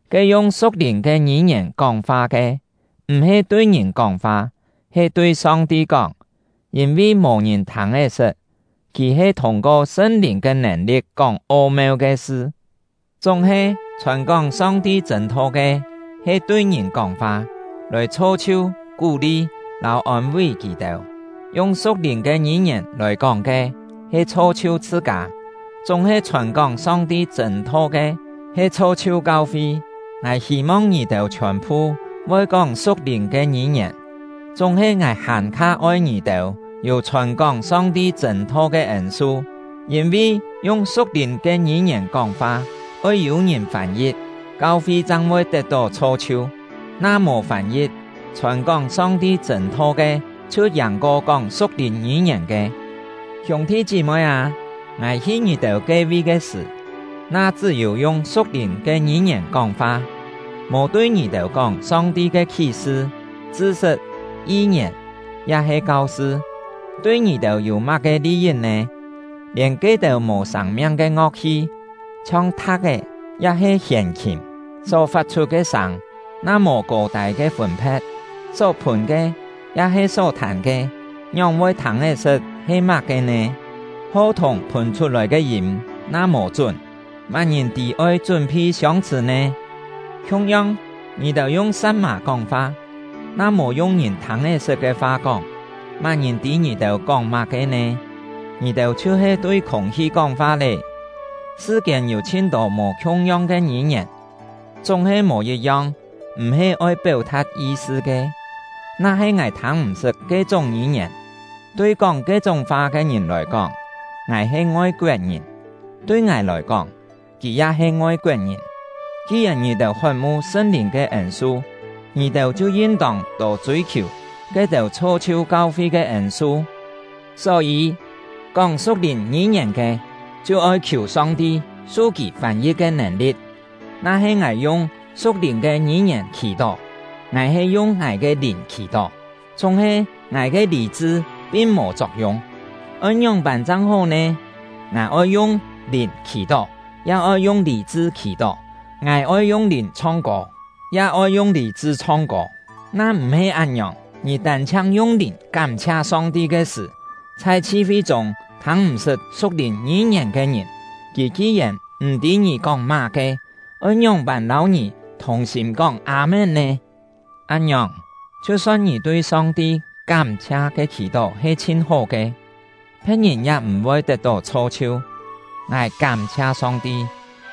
Ke yung su̍k-lìn ke ngî-ngièn kóng-fa ke, m̀-he tui ngìn kóng-fa, he tui Song-ti kóng, yîn-vi mò-ngìn thâng-é-sṳt; kì he thûng-ko Sṳn-Lìn ke nèn-li̍t kóng o-meu ke sṳ. Chúng-he, chhòn-kóng Song-ti chṳ̂n-tho ke, he tui ngìn kóng-fa, lòi chho-chhiu, kú-li, lâu ôn-ví kì-têu. Yung su̍k-lìn ke ngî-ngièn lòi kóng ke he chho-chhiu chhṳ-kâ, chúng-he chhòn-kóng Song-ti chṳ̂n-tho ke he chho-chhiu kau-fi. Ngài hî-mong ngì-têu chhiòn-phu voi kóng su̍k-lìn ke ngî-ngièn, chúng-he ngài hàn-kha oi ngì-têu yû chhòn-kóng Song-ti chṳ̂n-tho ke ên-su. Yîn-vi, yung su̍k-lìn ke ngî-ngièn kóng-fa, oi yû-ngìn fân-yi̍t, kau-fi chang voi tet-tó chho-chhiu; na mò fân-yi̍t, chhòn-kóng Song-ti chṳ̂n-tho ke chhiu yàng-ko kóng su̍k-lìn ngî-ngièn ke. Hiûng-thi chí-moi â, ngài hi ngì-têu ke-vi ke sṳ̀, na chṳ́-yû yung su̍k-lìn ke ngî-ngièn kóng-fa, mò tui ngì-têu kóng Song-ti ke khí-sṳ, chṳ-sṳt, yi-ngièn, ya-he kau-sṳ, tui ngì-têu yû má-ke li-yit nè? Lièn ke-têu mò sâng-miang ke ngo̍k-hi, chhiong tha̍k-é ya-he hièn-khìm, só fat-chhut ke sâng na mò kô-tâi ke fûn-phe̍t, só phùn ke ya-he só thàn ke ngióng-voi thâng-é-sṳt he má-ke nè? Ho-thùng phùn chhut-lòi ke yîm na mò chún, má-ngìn tî oi chún-phi siông-chhṳ̀ nè? Khiung-yong, ngì-têu yung sa̍t-mà kóng-fa, na mò yung ngìn thâng-é-sṳt ke fa kóng, má-ngìn tî ngì-têu kóng má-ke nè? Ngì-têu chhiu-he tui khûng-hi kóng-fa lé! Sṳ-kiên yû chhin-tô mò khiung-yong ke ngî-ngièn, chúng-he mò yit-yong m̀-he oi péu-tha̍t yi-sṳ ke. Na-he ngài thâng-m̀-sṳt ke-chúng ngî-ngièn, tui kóng ke-chúng fa ke ngìn lòi kóng, ngài he ngoi-koet-ngìn, tui ngài lòi kóng, kì ya he ngoi-koet-ngìn. Ki-yèn ngì-têu hot-mu Sṳn-Lìn ke ên-su, ngì-têu chhiu yin-tông tô chûi-khiù ke-têu chho-chhiu kau-fi ke ên-su. Só-yî, kóng su̍k-lìn ngî-ngièn ke, chhiu-oi khiù Song-ti su kì fân-yi̍t ke nèn-li̍t. Na-he ngài yung su̍k-lìn ke ngî-ngièn khì-tó, ngài he yung ngài ke lìn khì-tó, chúng-he ngài ke lî-chṳ pin mò chok-yung. Oi ngióng-pân chang hó nè? Ngài oi yung lìn khì-tó, ya oi yung lî-chṳ khì-tó; ngài oi yung lìn chhong-kô, ya oi yung lî-chṳ chhong-kô. Na m̀-he án-ngiòng, ngì tân-chhiang yung lìn kám-chhia Song-ti ke sṳ̀, chhai chhi-fi chûng thâng-m̀-sṳt su̍k-lìn ngî-ngièn ke ngìn, kì ki-yèn m̀-tî ngì kóng má-ke, oi ngióng-pân lâu ngì thùng-sîm kóng “Â-mén” nè? Án-ngiòng, chhiu-son ngì tui Song-ti kám-chhia ke khì-tó he chhin hó ke, phe̍t-ngìn ya m̀-voi tet-tó chho-chhiu. Ngài kám-chhia Song-ti,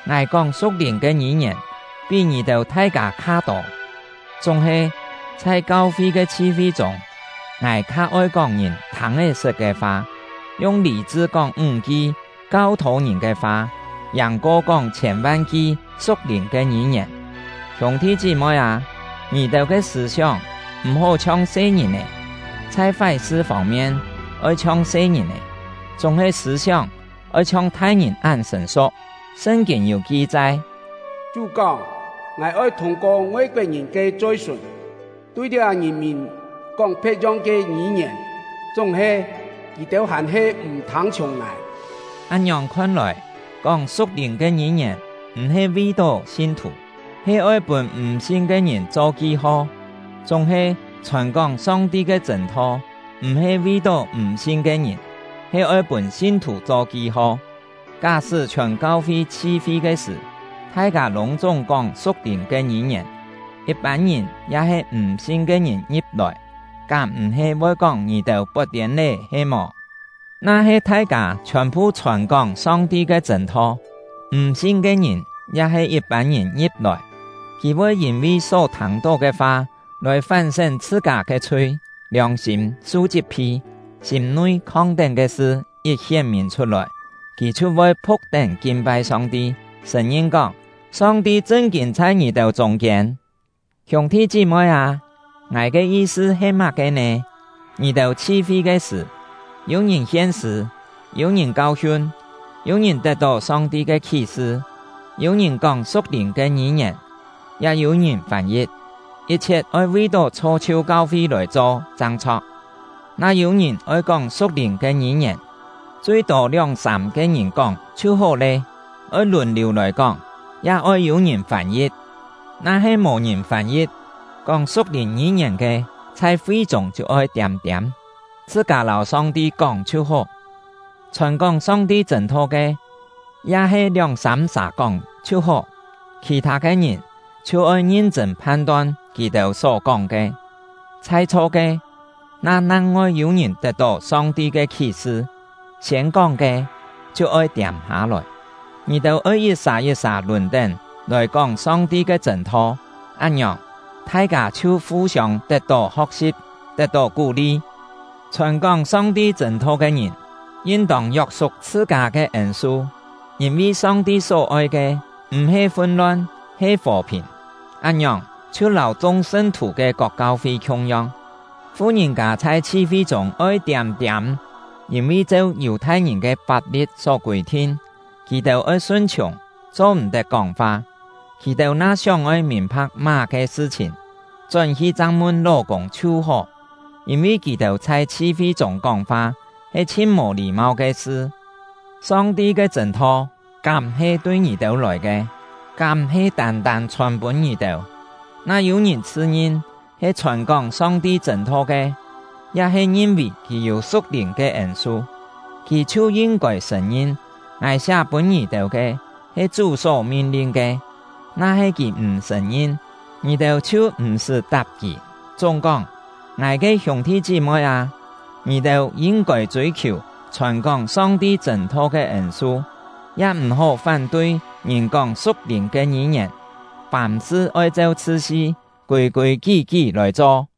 ngài kóng su̍k-lìn ke ngî-ngièn pí ngì-têu thai-kâ kha-tô. Chúng-he, chhai kau-fi ke chhi-fi chûng, ngài kha oi kóng ngìn thâng-é-sṳt ke fa; yung lî-chṳ kóng ńg-ki kau-thô ngìn ke fa kha yàng kóng chhiên-van-ki su̍k-lìn ke ngî-ngièn. Hiûng-thi chí-moi â, ngì-têu ke sṳ̂-sióng m̀-hó chhiong se-ngìn-è. Chhai fái-sṳ fông-mien oi chhiong se-ngìn-è, chúng-he sṳ̂-sióng oi chhiong thai-ngìn án sṳ̀n-su̍k. Sṳn-kîn yû ki-chai: Chú kóng: Ngài oi thûng-ko ngoi-koet-ngìn ke choi-sùn, tui liá ngìn-mìn kóng phe̍t-yong ke ngî-ngièn; chúng-he, kì-têu hàn-he m̀ thâng-chhiùng Ngài. Án-ngiòng khon-lòi, kóng su̍k-lìn ke ngî-ngièn m̀-he vi-tó sin-thù, he oi pûn m̀ sin ke ngìn cho ki-ho. Chúng-he, chhòn-kóng Song-ti ke chṳ̂n-tho m̀-he vi-tó m̀ sin ke ngìn, he oi pûn sin-thù cho ki-ho. Ká-sṳ́ chhiòn kau-fi chhi-fi ke sṳ̀, thai-kâ lûng-chúng kóng su̍k-lìn ke ngî-ngièn, yit-pân ngìn ya-he m̀ sin ke ngìn ngi̍p-lòi, kám m̀-he voi kóng ngì-têu pot-tiên lé he-mò? Na-he thai-kâ chhiòn-phu chhòn-kóng Song-ti ke chṳ̂n-tho, m̀ sin ke ngìn ya-he yit-pân ngìn ngi̍p-lòi, kì voi yîn-vi só thâng-tó ke fa lòi fán-sén chhṳ-kâ ke chhui, liòng-sîm su chit-phi; sîm-nui khong-tén ke sṳ yit hién-mìn chhut-lòi, kì chhiu voi phu̍k-tén kin-pai Song-ti, sṳ̀n-ngin kóng: “Song-ti chṳn-kîn chhai ngì-têu chûng-kiên!” Hiûng-thi chí-moi â, ngài ke yi-sṳ he má-ke nè? Ngì-têu chhi-fi ke sṳ̀, yû-ngìn hien-sṳ̂, yû-ngìn kau-hiun, yû-ngìn tet-tó Song-ti ke khí-sṳ, yû-ngìn kóng su̍k-lìn ke ngî-ngièn, ya yû-ngìn fân-yi̍t. Yit-chhiet oi vi-tó chho-chhiu kau-fi lòi cho chang chho̍k. Na yû-ngìn oi kóng su̍k-lìn ke ngî-ngièn, chui-tô lióng-sâm-ke ngìn kóng chhiu hó lé, oi lùn-liù lòi kóng, ya oi yû-ngìn fân-yi̍t. Na-he mò-ngìn fân-yi̍t, kóng su̍k-lìn ngî-ngièn ke chhai fi-chûng chhiu oi tiâm-tiâm, chhṳ-kâ lâu Song-ti kóng chhiu hó. Chhòn-kóng Song-ti chṳ̂n-tho ke, ya he lióng-sâm-sà kóng chhiu hó, khì-thâ ke ngìn chhiu oi ngin-chṳ̂n phan-ton kì-têu só kóng ke. Chhai-chho ke, na nang-ngoi yû-ngìn tet-tó Song-ti ke khí-sṳ, siên kóng ke chhiu oi tiâm-hâ-lòi. Ngì-têu oi yit-sà yit-sà lùn-tén lòi kóng Song-ti ke chṳ̂n-tho, án-ngiòng, thai-kâ chhiu fu-siông tet-tó ho̍k-si̍p, tet-tó kú-li. Chhòn-kóng Song-ti chṳ̂n-tho ke ngìn, yin-tông yok-suk chhṳ-kâ ke ên-su; yîn-vi Song-ti só-oi ke m̀-he fun-lon, he fò-phìn. Án-ngiòng, chhiu lâu chung sṳn-thù ke kok kau-fi khiung-yong, fu-ngìn-kâ chhai chhi-fi chûng oi tiâm-tiâm; yîn-vi cheu Yù-thai-ngìn ke fap-li̍t só kûi-thin, kì-têu oi sun-chhiùng, cho-m̀-tet kóng-fa. Kì-têu na sióng-oi mìn-pha̍k má-ke sṳ-chhìn, chón-hi chang mun ló-kûng chhiu hó; yîn-vi kì-têu chhai chhi-fi chûng kóng-fa he chhin mò lî-mau ke sṳ. Song-ti ke chṳ̂n-tho kám-he tui ngì-têu lòi ke? Kám-he tân-tân chhòn-pûn ngì-têu? Na yû-ngìn chhṳ-ngin he chhòn-kóng Song-ti chṳ̂n-tho ke, ya-he ngin-vì kì yû su̍k-lìn ke ên-su, kì chhiu yin-kôi sṳ̀n-ngin ngài siá pûn ngì-têu ke he Chú só min-lin ke. Na-he kì m̀ sṳ̀n-ngin, ngì-têu chhiu m̀-sṳ́ tap kì. Chúng-kóng, ngài ke hiûng-thi chí-moi â, ngì-têu yin-kôi chûi-khiù chhòn-kóng Song-ti chṳ̂n-tho ke ên-su, ya m̀-hó fán-tui ngìn kóng su̍k-lìn ke ngî-ngièn. Fàm-sṳ oi cheu chṳt-si, kûi-kûi kí-kí lòi cho.